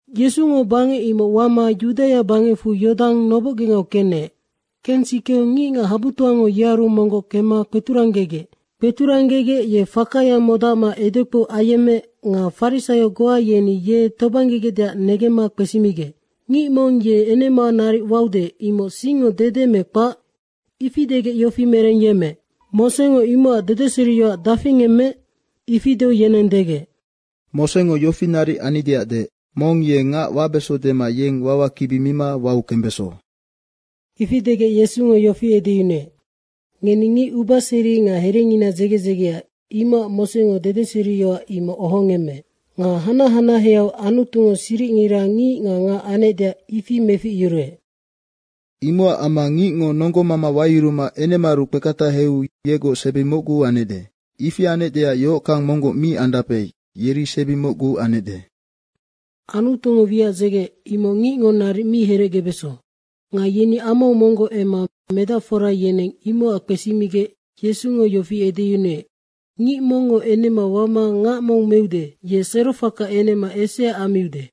Yesungo bangec imoc wama Yudaia bangecfu Yodang nobocgengau kenec. Kensikeu ngicngac habutoango yearu monggoc kemma kpeturanggegec. Kpeturanggegec ye fakaya modacma edekpou ayemmeec. Nga farisaio goa yeni ye tobanggegecdeac negemma kpesimigec, “Ngic mong ye enema naric waude, imoc singngo dede me kpac?” ifi degec yofi merengyemmeec, “Mosengo imocac dedeseriyoac dafi ngemmeec?” ifi deu yeneng degec, “Mosengo yofi naric annideac deec, ‘Mong ye ngac wabeso dema yeng wawakibi mima wau kembeso.’” Ifi degec Yesungo yofi edeyunuec, “Ngeni ngic ubaseri nga herengina dzege dzegea, imocac Mosengo dedeseriyoac imoc ohongemmeec. Nga hanac hanaheau Anutungo siricngira ngic nga ngac anecdeac, ifi meficyuruec. Imocac amma ngicngo nonggomama wayuruma enemaaru kpeketahau yegoc sebi mocgu anecde. Ifi anecdeac yohockang monggoc mi andape, yeri sebi mocgu anecde. Anutungo wiac dzegeec, imoc ngicngo naric mi herecgebeso.” Nga yeni amau monggoc emma medacfora yeneng imocac kpesimigec Yesungo yofi edeyunuec, “Ngic mongngo enema wama ngac mong meude, ye serofaka enema esea ammiude.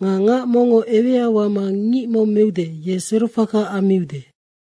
Nga ngac mongngo ewea wama ngic mong meude, ye serofaka ammiude.”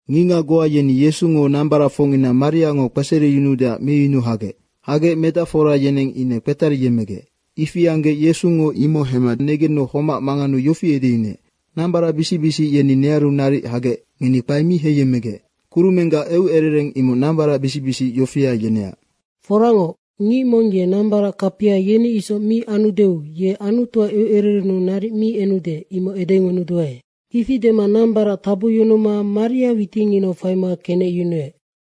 Ngicngac goa yeni Yesungo nambaracfocngina mariango kpesereyunuudeac meyunu hagec. Hagec medacfora yeneng ine kpetariyemmegec. Ifi anggec Yesungo imoc hemma negenu homac manganeu yofi edeyunuec, “Nambaracbisic yeni nearu naric hagec, ngeni kpae mi heiyemmegec. Kurumenggac eucerereng imoc nambaracbisic yofia yeneac. Foracngoc, ngic mong ye nambarac kapia yeni isoc mi anudeu ye Anutuac eucererennu naric mi enude, imoc edengunuduae.” Ifi dema nambarac tabucyunuma maria witinginau faima kenecyunuec.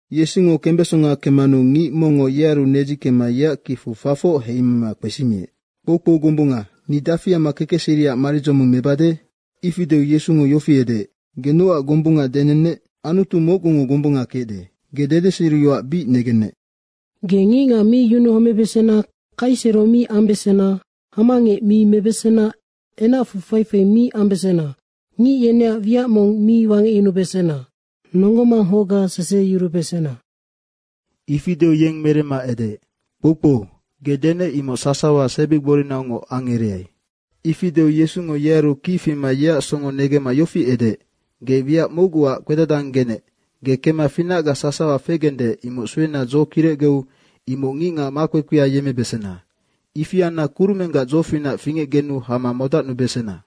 Yesungo kembesonga kemmanu ngic mongngo yearu nedzikemma yeac kicfu fafoc heima kpesimiec, “Kpoukpou gombunga, ni dafi amma kekecseriac maridzoming mebade?” ifi deu Yesungo yofi edeec, “Ge nocac gombunga denennec? Anutu mocgungo gombunga kecde. Ge dedeseriyoac bic negennec, ‘Ge ngicngac mi yunuhomebesena, kaisero mi ambesena, hamangec mi mebesena, enacfu faifai mi ambesena, ngic yeneac wiac mong mi wangecyunubesena, nonggo manghocga seseheyurubesena.’” Ifi deu yeng meremma edeec, “Kpoukpou, ge denec, imoc sasawa sebigborinaungoc angereai.” Ifi deu Yesungo yearu kic fima yeac songo negemma yofi edeec, “Ge wiac mocguac kpedadanggenec. Ge kemma finacga sasawa fegende, imoc suena dzo kirecgeu imoc ngicngac makpekpea yemmebesena. Ifi anna kurumenggac dzofinac fingecgenu hama modacnubesena!”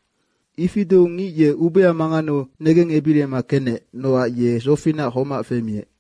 Ifi deu ngic ye ubea manganeu negengebirima kenec nocac ye dzofinaha homac femiec.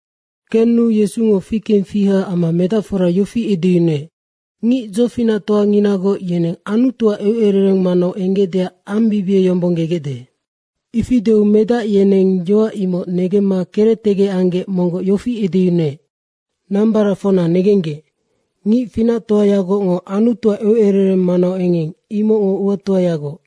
Kenu Yesungo fikengfiha amma medacfora yofi edeyunuec, “Ngic dzofinactoanginagoc yeneng Anutuac eucerereng manau enggecdeac ambibieyombonggegecde.” Ifi deu medac yeneng yoac imoc negemma kerectegec anggec monggoc yofi edeyunuec, “Nambaracfocna negenggec, ngic finactoayagocngo Anutuac eucerereng manau engeng, imoc uatoayagoc.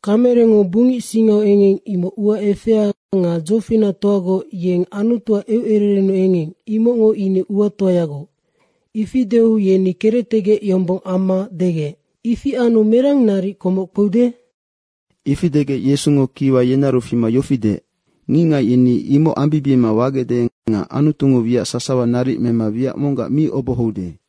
Kamerengo bungic singau engeng, imoc ua efea nga dzofinactoagoc yeng Anutuac eucererennu engeng, imocngo ine uatoayagoc.” Ifi deu yeni kerectegec yombong amma degec, “Ifi anu merang naric komoc kpeude?” Ifi degec Yesungo kiwa yenearu fima yofi deec, “Ngicngac yeni imoc ambibiema wagecde nga Anutungo wiac sasawa naric mema wiac monggac mi obohoude.”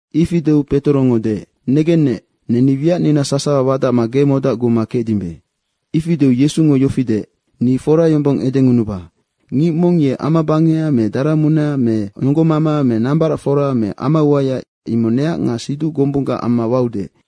Ifi deu Petorongo deec, “Negennec, neni wiacnina sasawa wadacma ge modacguma kecdimbe.” Ifi deu Yesungo yofi deec, “Ni fora yombong edengunuba, ngic mong ye amabangeha me daramunea me nonggomama me nambaracfora me amauaya, imoc neac nga siduc gombunggac amma waude,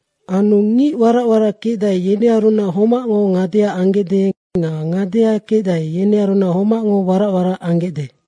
Anu ngic warac warac kecdae, yenearunac homacngo ngadea anggecde nga ngadea kecdae, yenearunac homacngo warac warac anggecde.”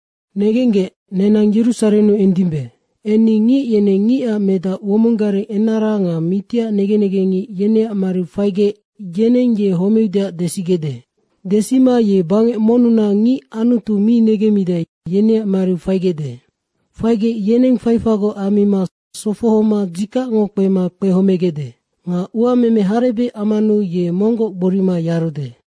“Negenggec, nenang Yerusarennu endimbe. Enni ngic yeneng Ngicac Medac womong gareng enara nga mitiac negen negengngic yeneac mariu faigec, yeneng ye homeudeac desigecde. Desima ye bangec monnunac ngic Anutu mi negemmidae, yeneac mariu faigecde. Faigec, yeneng faifagoc ammima sofohoma dzikacngo kpema kpehomegecde. Nga uameme harebec ammanu ye monggoc gborima yarude.”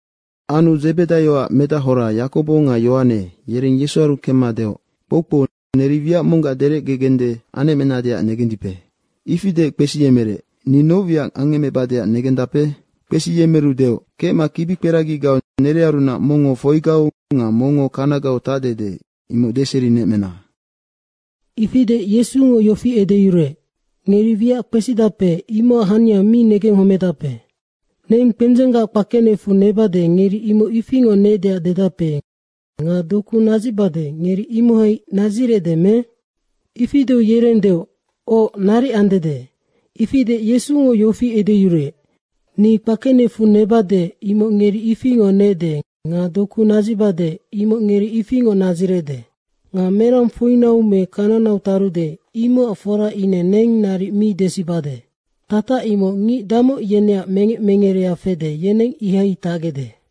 Anu Dzebedaioac medahora, Yakobo nga Yohane, yereng Yesuaru kemma deoc, “Kpoukpou, neri wiac monggac derecgede anecmenadeac negendipe?” Ifi deec kpesiyemerec, “Ni noc wiac angecmebadeac negendape?” Kpesiyemeru deoc, “Kecma kibikperagigau nerearunac mongngo foigau nga mongngo kanagau tacdede, imoc deserinemecna.” Ifi deec Yesungo yofi edeyuruec, “Ngeri wiac kpesidape, imocac hania mi negenghomedape. Neng kpendzenggac kpakenecfu nebade, ngeri imoc ifingoc neecdeac dedape nga doku nadzicbade, ngeri imohai nadzirecde me?” Ifi deu yereng deoc, “Oc, naric andede.” ifi deec Yesungo yofi edeyuruec, “Ni kpakenecfu nebade, imoc ngeri ifingoc neecde nga doku nadzicbade, imoc ngeri ifingoc nadzirecde. Nga merang foinau me kananau tarude, imocac fora ine neng naric mi desibade. Tatac imoc ngic damoc yeneac mengec mengerea fede, yeneng ihai tacgecde.”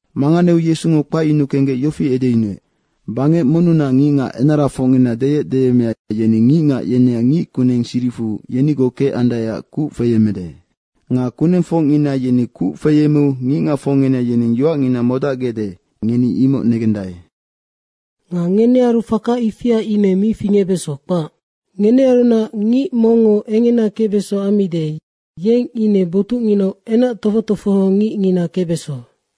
Manganeu Yesungo kpacyunuu kenggec yofi edeyunuec, “Bangec monnunac ngicngac enarafocngina deyecdeyemmea, yeni ngicngac yeneac ngickuneng siricfu yenigoc kecandaeac kuc feyemmede. Nga kunengfocngina yeni kuc feyemmeu ngicngacfocngina yeneng yoacngina modacgecde, ngeni imocnoc negendae. Nga ngenearu faka ifia ine mi fingecbeso, kpac. Ngenearunac ngic mongngo engena kecbeso ammide, yeng ine botucnginau kingang kpekpengina kecbeso.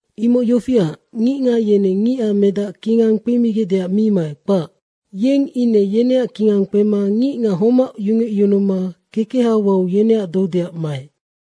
Imoc yofiac, ngicngac yeneng Ngicac Medac kingang kpemigecdeac mi maec, kpac. Yeng ine yeneac kingang kpema ngicngac homac yungecyunuma kekeha wau yeneac doudeac maec.”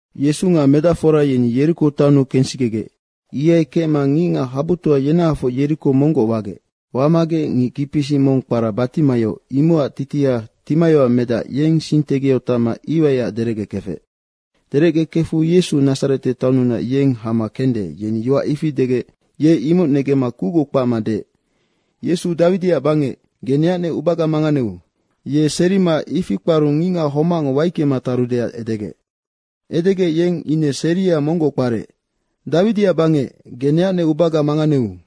Yesu nga medacfora yeni Yeriko taonnu kensikegec. Ihai kecma ngicngac habutoa yenahafoc Yeriko monggoc wagec. Wamagec ngic kicpisic mong kpara Batimaio, imocac titiha Timaioac medac, yeng sing tegiau tacma iwaiac derecgekefec. Derecgekefu Yesu Nadzarete taonnunac, yeng hama kende, yeni yoac ifi degec ye imoc negemma kucgoc kpacma deec, “Yesu, Dawidiac bangec, ge neacnec ubaga manganeu.” Ye serima ifi kparu ngicngac homacngo waicke tarudeac edegec. Edegec yeng ine seria monggoc kparec, “Dawidiac bangec, ge neacnec ubaga manganeu.”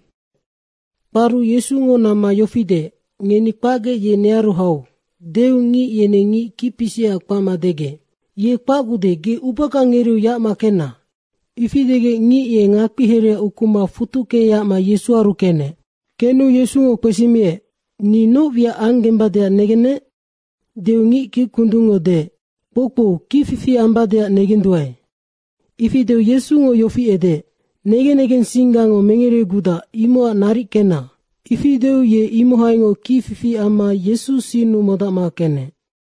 Kparu Yesungo namma yofi deec, “Ngeni kpacgec ye nearu hau.” deu ngic yeneng ngic kicpisicac kpacma degec, “Ye kpacgude, ge ubaga ngereeu yacma kenna.” Ifi degec ngic ye ngakpihereha ukuma futucke yacma Yesuaru kenec. Kenu Yesungo kpesimiec, “Ni noc wiac anggembadeac negennec?” deu ngic kickundungngo deec, “Kpoukpou, kicfifi ambadeac negenduae.” Ifi deu Yesungo yofi edeec, “Negen negensinggango mengeregudac imocac naric kenna!” Ifi deu ye imohaingoc kicfifi amma Yesu sinnu modacma kenec.